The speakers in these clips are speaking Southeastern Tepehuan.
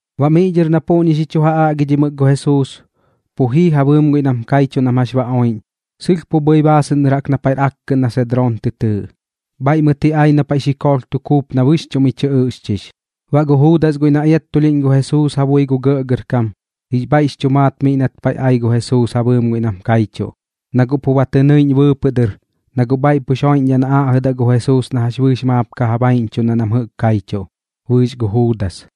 Baꞌ miꞌ dhɨr na puꞌñi xi chu aꞌgimɨk gu Jesuus, pu jii ja bɨɨm guiꞌ nam kaichuꞌ nam jax ba oiꞌñ, sɨlh pu bhɨi baasɨꞌn dɨr jaꞌk na paiꞌr akkɨꞌn na Sedroon tɨ tɨɨꞌ. Bhaiꞌ mɨt ji ai na paiꞌ xikoolh tu kuup na bɨxchuꞌ mi chɨ ɨꞌxchix. Baꞌ gu Juudas guiꞌ na iattulhiꞌñ gu Jesuus ja bui gu gɇꞌgɇrkam, jix bhaiꞌx chu maat miꞌ nat paiꞌ ai gu Jesuus ja bɨɨm guiꞌ nam kaichuꞌ, na guꞌ pu ba tɨ nɨiꞌñ bɨɨpɨꞌ dɨr, na guꞌ bhaiꞌ pux joiꞌñdhaꞌ na aꞌjɨdaꞌ gu Jesuus na jax bɨɨx maap ka ja baiꞌñchuꞌndaꞌ nam jɨꞌk kaichuꞌ, bɨɨx gu Juudas.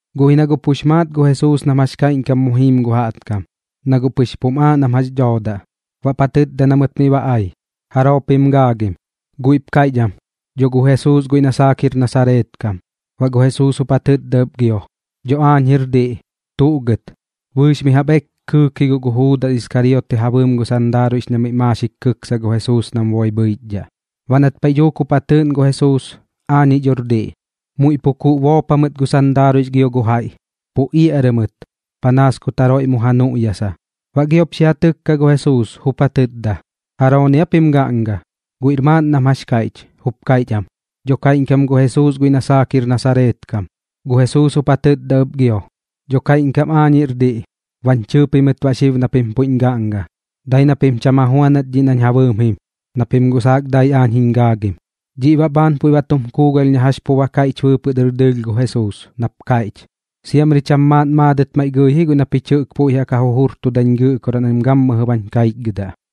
Guꞌ ji na guꞌ pux maat gu Jesuus nam jax kaiꞌñkam mu jiim gu jaꞌtkam, na guꞌ pɨx pum aaꞌ nam jax dhoodaꞌ. Baꞌp ja tɨtda na mɨt miꞌ ba ai: ―¿Jaroo pim gaagim? Guiꞌp kaiꞌch am: ―Dho gu Jesuus guiꞌ na saak jir Nasareet kam. Baꞌ gu Jesuus jup ja tɨtda ɨp gio: ―Dho aañ jir diꞌ. ¿Tuꞌ gɨt? Bɨɨx mi jaꞌp eek kɨɨk ji guꞌ gu Juudas Iskarioti ja bɨɨm gu sandaaruiꞌx na miꞌ maaxik kɨksa gu Jesuus nam boi bhɨichdhaꞌ. Baꞌ nat paiꞌ dhuuk jup ja tɨɨꞌn gu Jesuus: “Aañiꞌ dhor diꞌ”, muiꞌ pu kuꞌ boop jamɨt gu sandaaruiꞌx gio gu jaiꞌ, pu iaꞌrɨ mɨt, panaas kut jaroiꞌ mu ja nuꞌyasa. Baꞌ giop xi ja tɨkka gu Jesuus, jup ja tɨtda: ―¿Jarooni aa pim gaꞌnga? Guiꞌr maaꞌn nam jax kaiꞌch, jup kaiꞌch am: ―Dho kaiꞌñkam gu Jesuus guiꞌ na saak jir Nasareet kam. Gu Jesuus jup ja tɨtda ɨp gio: ―Dho kaiꞌñkam aañ jir diꞌ. Bañ chɨɨ pimɨt baꞌ xib na pim puiꞌñ gaꞌnga. Dai na pim cham ja juanat dhiꞌ nañ ja bɨɨm jim, na pim guꞌ saak dai aañ jiñ gaagim. Dhiꞌ baꞌ bhaan puiꞌ ba tum kuugalh na jax pu ba kaiꞌch bɨɨpɨꞌ dɨr dɨɨlh gu Jesuus, nap kaiꞌch: “Siamri cham maaꞌn maadɨt maiꞌ gɨi ji guiꞌ na pich jɨꞌk puiꞌ jaꞌk ja jujurtudañ Gɨꞌkoraꞌ nam gammɨjɨ bañ kaichgɨdaꞌ.”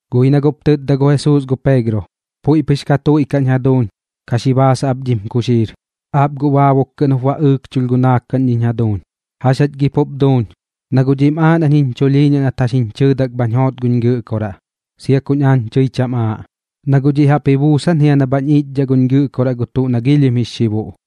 Guꞌ ji na guꞌp tɨtda gu Jesuus gu Peegro: ―Puiꞌ pɨx ka tuiꞌkaꞌñ jaduuñ. Ka xi baasaꞌ ap dhim kuxiir. Aap guꞌ baabuk kɨꞌn jup ba ɨɨkchulh gu naakaꞌn dhiñ jaduuñ. ¿Jax jach gi pup duuñ? Na guꞌ dhiꞌm aaꞌ nañ jiñ chulhiiñaꞌ nat jax jiñ chɨɨdak bhañ joot guñ Gɨꞌkoraꞌ, sia kuñ aañ tɨi cham aaꞌ. Na guꞌ dhiꞌ jaꞌp ji buusan jia na bhañ iꞌchdhaꞌ guñ Gɨꞌkoraꞌ gu tuꞌ na giilhim jix xibuꞌ.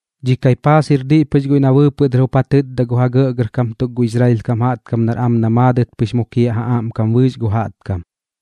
Dhi Kaipaas jir diꞌ pɨx guiꞌ na bɨɨpɨꞌ dɨr jup ja tɨtda gu ja gɇꞌgɇrkam tuk gu Israel kam jaꞌtkam nar am na maadɨt pɨx mukiaꞌ ja aꞌmkam bɨɨx gu jaꞌtkam.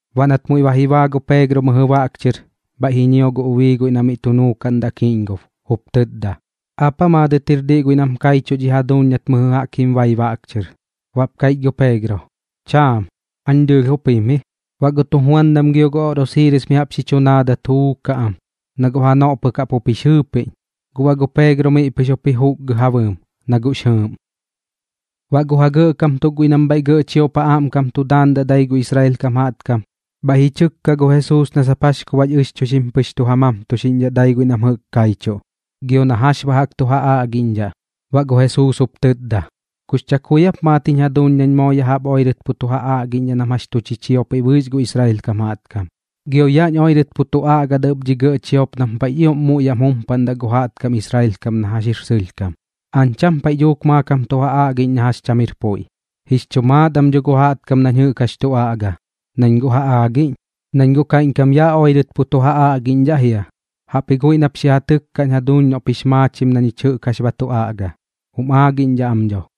Baꞌ nat muiꞌ ba ji baa gu Peegro mɨjɨ baꞌk chɨr, bhaiꞌ ji ñio gu ubii guiꞌ na miꞌ tu nuukaꞌndaꞌ kiꞌñgob, jup tɨtda: ―¿Aap aa maadɨt jir diꞌ guiꞌ nam kaichuꞌ dhi jaduuñ nat mɨjɨ jaꞌk jim bai baꞌk chɨr? Baꞌp kaiꞌch gu Peegro: ―Chaam. Aañ dɨɨlh jup jim ji. Baꞌ gu tujuandam gio gu oꞌrosiiris mi jaꞌp xi chu naadat juukaꞌ am, na guꞌ janoꞌ pɨk jaꞌk jup jix jɨɨpiꞌñ. Guꞌ baꞌ gu Peegro miꞌ pɨx jup ji juukgɨ ja bɨɨm, na guꞌx jɨɨꞌm. Baꞌ gu ja gɇꞌkam tuk guiꞌ nam bhaiꞌ gɇꞌ chiop ja aꞌmkam tu daandaꞌ dai gu Israel kam jaꞌtkam, bhaiꞌ ji chɨkka gu Jesuus na sap jax ku baꞌx ɨxchuixim pɨx tu ja mamtuxiꞌñdhaꞌ dai guiꞌ nam jɨꞌk kaichuꞌ, gio na jax baꞌ jaꞌk tu ja aꞌgiꞌñdhaꞌ. Baꞌ gu Jesuus jup tɨtda: ―¿Kux chakui aap maat jiñ jaduuñ nañ moo ya jaꞌp oirɨt pu tu ja aꞌgiꞌñdhaꞌ nam jax tu chichiopiꞌ bɨɨx gu Israel kam jaꞌtkam? Gio yaꞌñ oirɨt pu tu aꞌgadaꞌ ɨp dhi gɇꞌ chiop nam paiꞌx ioꞌm muiꞌ yaꞌm jumpaꞌndaꞌ gu jaꞌtkam Israel kam na jax jir sɨlhkam. Aañ cham paiꞌ dhuuk maakam tu ja aꞌgiꞌñ na jax cham jir puiꞌ. Jix chu maat am dho gu jaꞌtkam nañ jɨꞌk jax tu aꞌgaꞌ, nañ guꞌ ja aagiꞌñ, nañ guꞌ kaiꞌñkam yaꞌ oirɨt pu tu ja aꞌgiꞌñdhaꞌ jia. Jaꞌpji guiꞌ nap xi ja tɨkkaꞌñ jaduuñ noꞌp jix maachim na ñich jɨꞌk jax ba tu aꞌga. Jum aagiꞌñdhaꞌ am dho.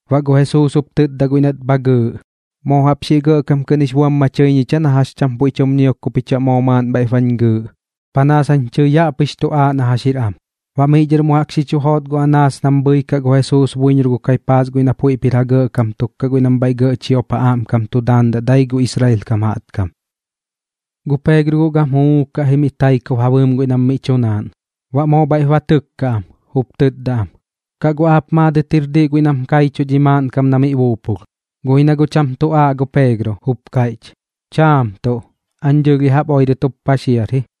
Baꞌ gu Jesuus jup tɨtda guiꞌ nat bha gɨɨꞌ: ―¿Moo jaꞌp xiꞌ gɇꞌkam kɨꞌn jix buam ma chɨi ñich aa na jax cham puiꞌ tum ñiok ku pich baꞌ moo maaꞌn bhaiꞌp bañ gɨɨꞌ? Panaas jañ tɨi yaꞌ pɨx tu aaꞌ na jax jir am. Baꞌ miꞌ dhɨr mu jaꞌk xi chu joot gu Anaas nam bhɨikaꞌ gu Jesuus buiñor gu Kaipaas guiꞌ na puiꞌp jir ja gɇꞌkam tuk kaꞌ guiꞌ nam bhaiꞌ gɇꞌ chiop ja aꞌmkam tu daandaꞌ dai gu Israel kam jaꞌtkam. Gu Peegro guꞌ gam juukaꞌ ji mi taikob ja bɨɨm guiꞌ nam miꞌ tu naaꞌn. Baꞌ moo bhaiꞌp ba tɨkkaꞌ am, jup tɨtda am: ―¿Kaꞌ guꞌ aap maadɨt jir diꞌ guiꞌ nam kaichuꞌ dhi maaꞌnkam na miꞌ buupulh? Guꞌ ji na guꞌ cham tu aaꞌ gu Peegro, jup kaiꞌch: ―Chaam tuꞌ. Aañ dɨɨlh ya jaꞌp oirɨt jup paxiar ji.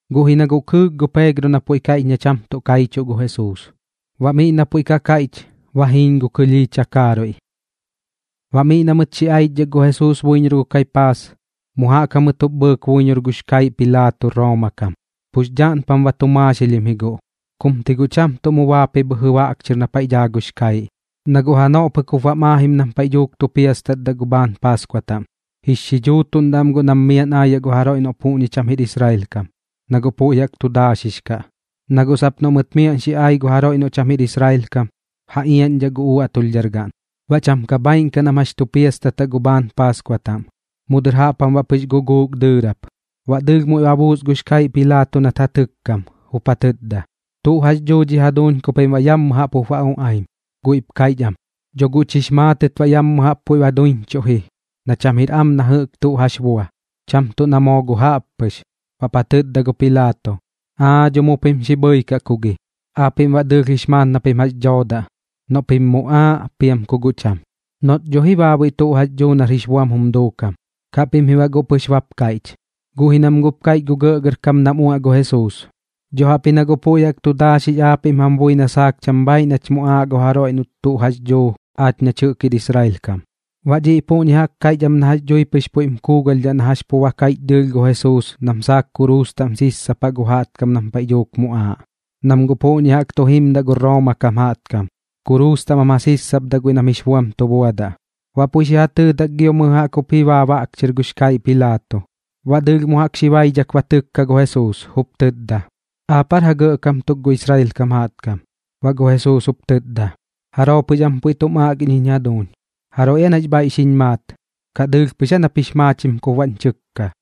Guꞌ ji na guꞌ kɨɨk gu Peegro na puiꞌ kaiꞌch na cham tuꞌ kaichuꞌ gu Jesuus. Baꞌ miꞌ na puiꞌ ka kaiꞌch, ba jiiñ gu kɨlhii takaaruiꞌ. Baꞌ miꞌ na mɨt xi aichdhak gu Jesuus buiñor gu Kaipaas, mu jaꞌk jamɨt jup bhɨɨk buiñor gux kaiꞌ Pilaato Rooma kam. Pux dhaꞌnpam ba tu maaxilhim ji guꞌ, kum ti guꞌ cham mu baap ji bhɨjɨ baꞌk chɨr na paiꞌ dhaa gux kaiꞌ, na guꞌ janoꞌ pɨk jup bam aajim nam paiꞌ dhuuk tu piastatdaꞌ gu bhaan Paaskua taꞌm. Jix xidhuutuꞌndaꞌ am guꞌ nam miaꞌn aayaꞌ gu jaroiꞌ noꞌ puꞌñi cham jir Israel kam, na guꞌ puiꞌ jaꞌk tu daaxix kaꞌ. Na guꞌ sap noꞌ mɨt miaꞌn xi ai gu jaroiꞌ noꞌ cham jir Israel kam, ja iaꞌñdhaꞌ gu uaꞌtulhdhargaꞌn, baꞌ cham ka bhaaiꞌn kaꞌ nam jax tu piastataꞌ gu bhaan Paaskua taꞌm. Mu dɨr jaꞌp jam baꞌ pɨx guguuk dɨɨrap, baꞌ dɨɨlh muiꞌ ma buus gux kaiꞌ Pilaato nat ja tɨkkam, jup ja tɨtda: ―¿Tuꞌ jax dhuu dhi jaduuñ ku pim baꞌ yammɨ jaꞌp jup ba uꞌaim? Guiꞌp kaiꞌch am: ―Dho guꞌch jix maatɨt baꞌ yammɨ jaꞌp puiꞌ ba duiñchuꞌ ji na cham jir am na jɨꞌk tuꞌ jax bua, cham tuꞌ na moo guꞌ jaꞌp pɨx. Baꞌp ja tɨtda gu Pilaato: ―Aa dho, mu pim xi bhɨikaꞌ ku gi. Aapiꞌm baꞌ dɨɨlh jix maat na pim jax dhoodaꞌ, noꞌ pim muꞌaaꞌ piam ku guꞌ cham, noꞌt dho ji baabuiꞌ tuꞌ jax dhuu nar jix buam jum duukam, kaꞌ pim ji baꞌ guꞌ pɨx bap kaiꞌch. Guꞌ ji nam guꞌp kaiꞌch gu gɇꞌgɇrkam nam uaꞌ gu Jesuus: ―Dho jaꞌpji na guꞌ puiꞌ jaꞌk tu daaxix aapiꞌm jam bui na saak cham bhaiꞌ nach muꞌaaꞌ gu jaroiꞌ noꞌt tuꞌ jax dhuu aach nach jɨꞌk jir Israel kam. Baꞌ dhiꞌ puꞌñi jaꞌk kaiꞌch am na jax dhui pɨx puiꞌm kuugalhdhaꞌ na jax pu ba kaiꞌch dɨɨlh gu Jesuus nam saak kuruus taꞌm sissapa gu jaꞌtkam nam paiꞌ dhuuk muꞌaaꞌ, nam guꞌ puꞌñi jaꞌk tu jimdaꞌ gu Rooma kam jaꞌtkam, kuruus taꞌm jam ja sissapdaꞌ guiꞌ nam jix buam tu buadaꞌ. Baꞌ puiꞌ xi ja tɨɨdak gio mɨjɨ jaꞌk jup ji baa baꞌk chɨr gux kaiꞌ Pilaato, baꞌ dɨɨlh mu jaꞌk xi baidhak ba tɨkka gu Jesuus, jup tɨtda: ―¿Aapiꞌ aar ja gɇꞌkam tuk gu Israel kam jaꞌtkam? Baꞌ gu Jesuus jup tɨtda: ―¿Jaroo pɨx am puiꞌ tum aꞌgiꞌñ jiñ jaduuñ? ¿Jaroiꞌ aa nax bhaiꞌ xiñ maat, kaꞌ dɨɨlh pɨx aa nap jix maachim kup baꞌñ chɨkka?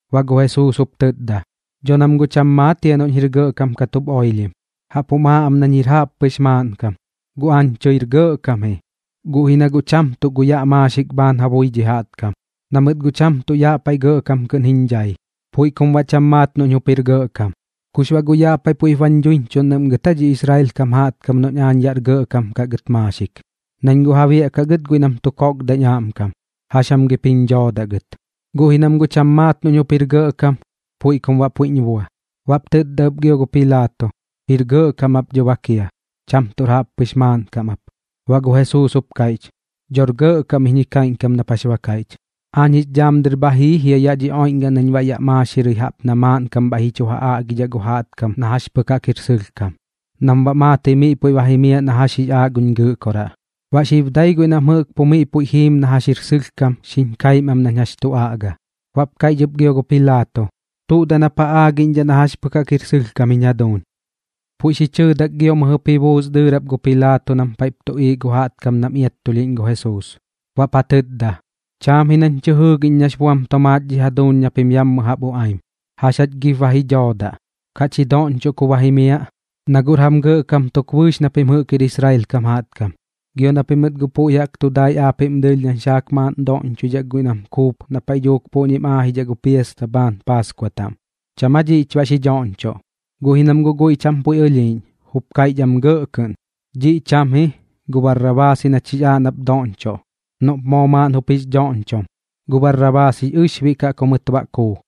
Baꞌ gu Jesuus jup tɨtda: ―Dho nam guꞌ cham maat jia noꞌñ jir gɇꞌkam kat jup oilhim, jaꞌp jum aaꞌ am nañ jir jaꞌppɨx maaꞌnkam. Guꞌ aañ tɨir gɇꞌkam ji, guꞌ ji na guꞌ cham tuꞌ gu yaꞌ maaxik bhaan ja bui dhi jaꞌtkam, na mɨt guꞌ cham tuꞌ yaꞌ paiꞌ gɇꞌkam kɨꞌn jiñ dhai. Puiꞌ kum baꞌ cham maat noꞌñ jup jir gɇꞌkam. ¿Kux baꞌ guꞌ yaꞌ paiꞌ puiꞌp bañ dhuiñchuꞌndaꞌm gɨt aa dhi Israel kam jaꞌtkam noꞌñ aañ yaꞌr gɇꞌkam kaꞌ gɨt maaxik? Nañ guꞌ ja biaꞌkaꞌ gɨt guiꞌ nam tu kokdaꞌñ aꞌmkam, ¿jax jam gip jiñ dhoodaꞌ gɨt? Guꞌ ji nam guꞌ cham maat noꞌñ jup jir gɇꞌkam, puiꞌ kum baꞌ puiꞌñ bua. Baꞌp tɨtda ɨp gio gu Pilaato: ―Jir gɇꞌkam ap dho bak jia, cham tuꞌr jaꞌppɨx maaꞌnkam ap. Baꞌ gu Jesuus jup kaiꞌch: ―Dhor gɇꞌkam iñ ji kaiꞌñkam nap jax ba kaiꞌch. Aañ jix dhaam dɨr bha jii jia yaꞌ dhi oiꞌñgaꞌn nañ baꞌ yaꞌ maaxirɨi jaꞌp na maaꞌnkam bhaiꞌ ji chu ja aꞌgidhaꞌ gu jaꞌtkam na jax pɨk jaꞌk jir sɨlhkam, nam baꞌ maatɨi miꞌ puiꞌ ba jimiaꞌ na jax jix aaꞌ guñ Gɨꞌkoraꞌ. Baꞌ xib dai guiꞌ nam jɨꞌk pu miꞌ puiꞌ jiim na jax jir sɨlhkam xiñ kaim am nañ jax tu aꞌga. Baꞌp kaiꞌch ɨp gio gu Pilaato: ―¿Tuꞌ daꞌ nap ja aagiꞌñdhaꞌ na jax pɨk jaꞌk jir sɨlhkam jiñ jaduuñ? Puiꞌ xi chɨɨdak gio mɨjɨp ji buus dɨɨrap gu Pilaato nam paiꞌp tuꞌiiꞌ gu jaꞌtkam nam iattulhiꞌñ gu Jesuus. Baꞌp ja tɨtda: ―Cham ji nañ tɨ jɨɨgiꞌñ nax buam tomaat dhi jaduuñ na pim ya jaꞌp uꞌaim. ¿Jax jach gip ba ji dhoodaꞌ? ¿Kaꞌch ji doꞌñchoꞌ ku ba jimiaꞌ? Naguꞌr jam gɇꞌkam tuk bɨɨx na pim jɨꞌk jir Israel kam jaꞌtkam. Gio na pimɨt guꞌ puiꞌ jaꞌk tu dai aapiꞌm dɨɨlh nañ saak maaꞌn doꞌñchoidhaꞌ guiꞌ nam kuup na paiꞌ dhuuk puꞌñim aajidhaꞌ gu piasta bhaan Paaskua taꞌm. ¿Cham aa dhiꞌch baꞌ xi dhoꞌñchoꞌ? Guꞌ ji nam guꞌ guiꞌ cham tuꞌ puiꞌ ɨlhiiꞌñ, jup kaiꞌch am gɇꞌ kɨꞌn: ―Dhiꞌ cham ji. Gu Barrabaas ji nach jix aaꞌ nap doꞌñchoꞌ noꞌp moo maaꞌn jup jix dhoꞌñchom. Gu Barrabaas jix ɨxbiꞌ kaꞌ ku mɨt baꞌ kuu.